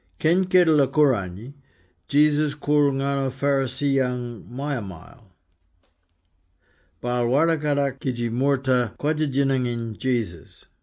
Keny Kedela-Kooranyi, Jesus koorl ngarno Pharisee-yang maya-mayal. Baal warda-kadak kidji moorta kwadja-djinanginy Jesus.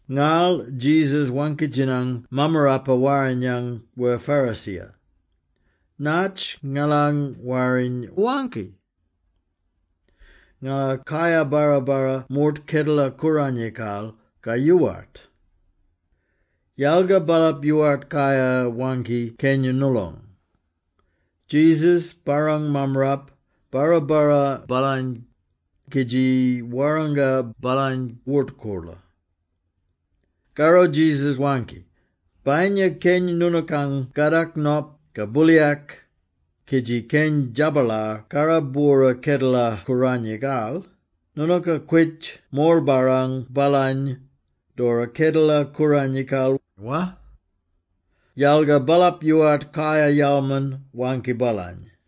Ngarl Jesus waangki-djinang Mammarapa-Warrinyang wer Pharisee-ya, “Natj ngalang Warriny waangki? Ngala kayar-barra-barra moort Kedela-Kooranyikal ka yoowart?” Yalga baalap yoowart kayar-waangki keny noolong. Jesus barrang mammarap, barra-barra baalany, kidji warranga baalany wort-koorlo. Karro Jesus waangki, “Bayinya keny noonookang kadak nop ka booliyak, kidji keny djabalar karrab-bwora Kedela-Kooranyikal, noonooka kwitj morl-barrang baalany, doora Kedela-Kooranyikal, wa?” Yalga baalap yoowart kayar-yalman-waangki baalany.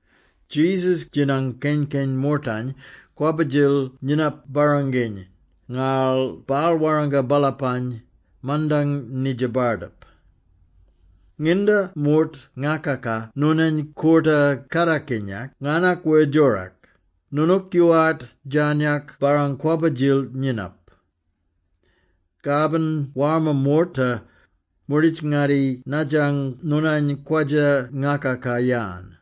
Jesus djinang keny-keny moortany kwabba-djil nyinap barranginy, ngarl baal warranga baalapany mandang nidja bardip. “Nginda moort ngakaka noonany koorta-kadakinyak ngarnak wer djorak, noonook yoowart djarnyak barrang kwabba-djil nyinap. Kabin warma moorta, moorditj-ngatti nadjang noonany kwadja-ngakaka-yan,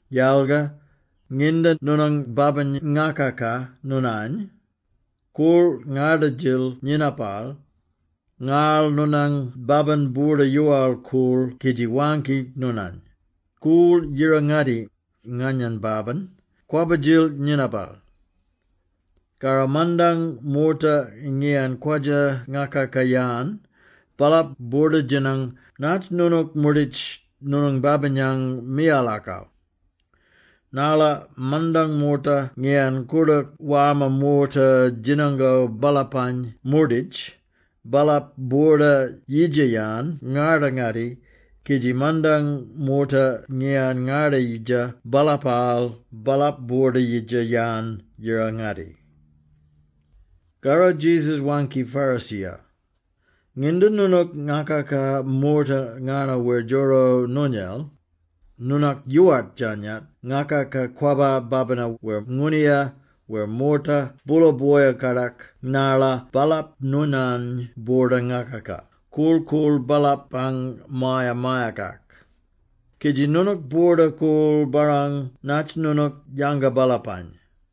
Yalga, nginda noonang babin ngakaka noonany, koorl ngarda-djil nyinapal, ngarl noonang babin boorda-yoowal-koorl kidji waangki noonany, ‘Koorl yira-ngatti, nganyang babin, kwabba-djil nyinapal.’ Karro mandang moorta ngiyan kwadja-ngakaka-yan, baalap boorda-djinang natj noonook moorditj noonang babinang miyalakal. Narla mandang moorta ngiyan koordook warma moorta djinango baalapany moorditj, baalap boorda yidja-yan ngarda-ngatti, kidji mandang moorta ngiyan ngarda-yidja baalapaal, baalap boorda-yidja-yan yira-ngatti.” Karro Jesus waangki Pharisee-ya, “Nginda noonook ngakaka moorta ngarno wer djoro noonyel, noonook yoowart djarnyak ngakaka kwabba babina wer ngooniya wer moorta boola boya-kadak narla baalap noonany boorda-ngakaka korl-koorl baalapang maya-mayakak, kidji noonook boorda-korl-barrang natj noonook yanga baalapany.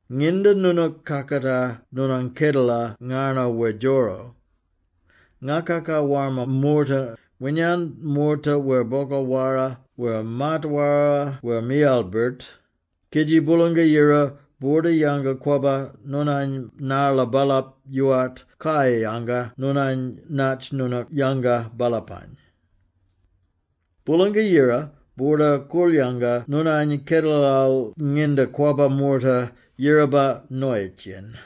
Nginda noonook kakatar noonang kedela ngarno wer djoro, ngakaka warma moorta - winyan moorta wer bogal-wara wer maat-wara wer miyala-birt, kidji Boolanga-Yira boorda-yanga-kwabba noonany narla baalap yoowart kayar-yanga noonany natj noonook yanga baalapany. Boolanga-Yira boorda-korl-yanga noonany kedelal nginda kwabba moorta yiraba noyitj-yen.”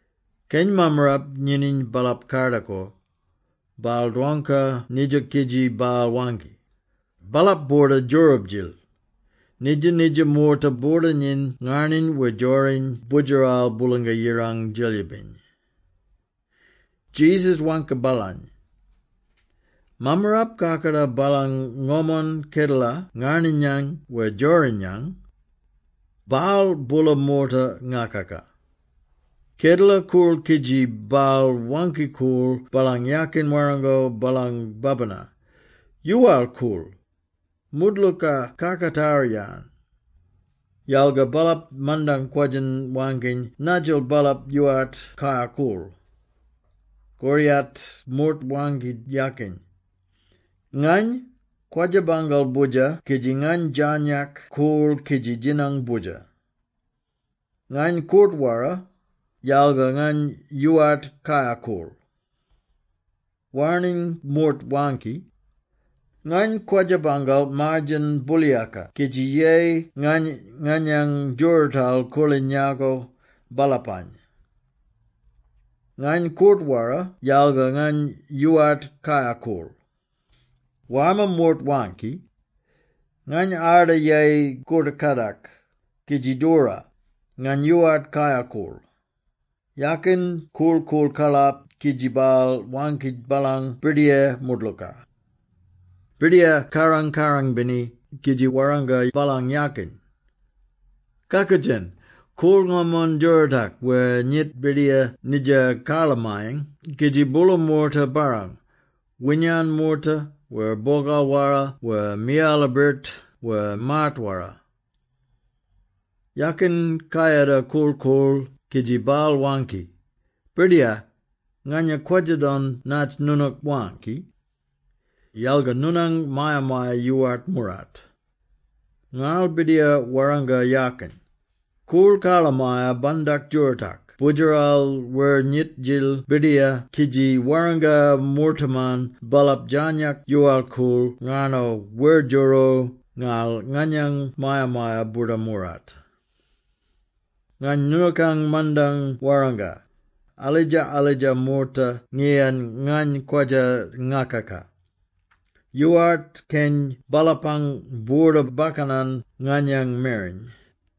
Keny mammarap nyininy baalap-kardakor, baal dwangka nidja kidji baal waangki, “Baalap boorda-djoorab-djil! Nidja-nidja moorta boorda-nyiny ngarniny wer djoriny Boodjeral Boolanga-Yirang Djelyibiny!” Jesus waangki baalany, “Mammarap kakatar baalang ngomon kedela ngarninyang wer djorinyang. Baal boola moorta ngakaka. Kedela koorl kidji baal waangki-koorl baalang yakin warrango baalang babina, ‘Yoowal-koorl! Moodlooka kakatar-yan!’ Yalga baalap mandang kwadjin waangkiny nadjil baalap yoowart kayar-koorl. Koriyat moort waangki yakin, ‘Ngany kwadja-bangal boodjer kidji ngany djarnyak koorl kidji djinang boodjer. Ngany koort-wara, yalga ngany yoowart kayar-koorl.’ Warning moort waangki, ‘Ngany kwadja-bangal maar-djen booliyaka kidji yeyi ngany nganyang djoorootal koorliny yako baalapany. Ngany koort-wara yalga ngany yoowart kayar-koorl.’ Warma moort waangki, ‘Ngany arda yeyi koort-kadak, kidji doora, ngany yoowart kayar-koorl.’ Yakin korl-koorl karlap kidji baal waangki baalang birdiyar moodlooka.” “Birdiyar kaarang-kaarang-bini kidji warranga baalang yakin, ‘Kakoodjen! Koorl ngomon djoorootak wer nyit bidiya nidja karlamayang kidji boola moorta barrang, winyan moorta wer bogal-wara wer miyala-birt wer maat-wara.’ Yakin kayada korl-koorl kidji baal waangki, ‘Birdiyar, nganya kwadja-don natj noonook waangki. Yalga noonang maya-maya yoowart moorart.’ Ngarl birdiyar warranga yakin, ‘Koorl karlamaya-bandak djoorootak boodjeral wer nyit-djil bidiya kidji warranga moortaman baalap djarnyak yoowal-koorl ngarno wer djoro, ngarl nganyang maya-maya boorda moorart.’ Ngany noonookang mandang warranga, alidja-alidja moorta ngiyan ngany kwadja ngakaka, yoowart keny baalapang boorda-bakkanan nganyang mereny!’”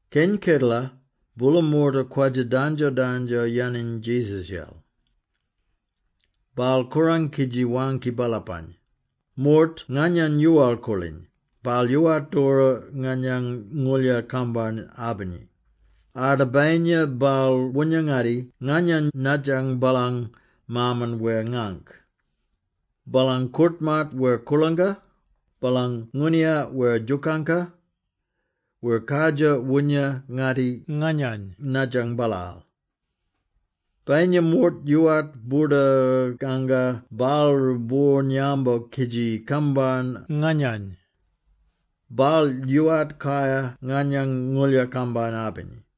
Keny kedela, boola moorta kwadja dandjo-dandjo-yaniny Jesus-yel. Baal korang kidji waangki baalapany, “Moort nganyany yoowal-koorliny, baal yoowart doora nganyang ngooldjar-kambarn-abini, arda bayinya baal woonya-ngatti nganyany nadjang baalang maaman wer ngaangk, baalang koort-maat wer koorlangka, baalang ngooniya wer djooka, wer kardjir woonya-ngatti nganyany nadjang baalaal. Bayinya moort yoowart boorda-kanga baalroo boorn-yambo kidji kambarn nganyany, baal yoowart kayar nganyang ngooldjar-kambarn-abini.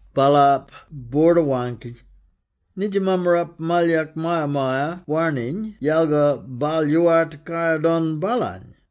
Baalap boorda-waangki. ‘Nidja mammarap malyak maya-maya warniny yalga baal yoowart kayar-don baalany!’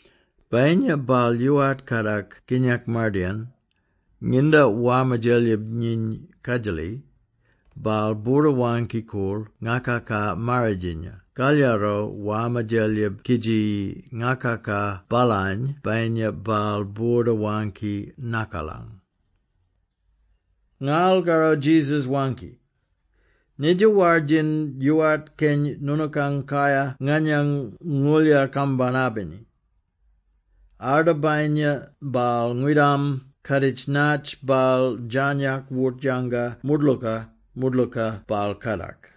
Bayinya baal yoowart kadak kinyak mardayin, nginda warma djelyib nyiny kadjali, baal boorda-waangki-koorl ngakaka-marridjinya kalyaro warma djelyib kidji ngakaka baalany bayinya baal boorda waangki nakalang.” Ngarl karro Jesus waangki, “Nidja war-djin, yoowart keny noonookang kayar nganyang ngooldjar-kambarn-abini, arda bayinya baal ngwidam kaaditj natj baal djarnyak wort-yanga moodlooka, moodlooka baal kadak.”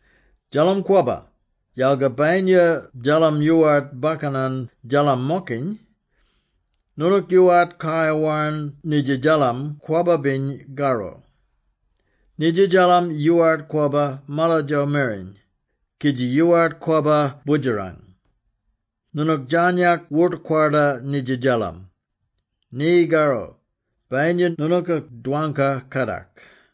“Djallam kwabba, yalga bayinya djallam yoowart bakkanan djallam-mokiny, noonook yoowart kayar warn nidja djallam kwabba-biny karro. Nidja djallam yoowart kwabba malatjo mereny, kidji yoowart kwabba boodjerang. Noonook djarnyak wort-kwarda nidja djallam. Ni karro, bayinya noonooka dwangka kadak!”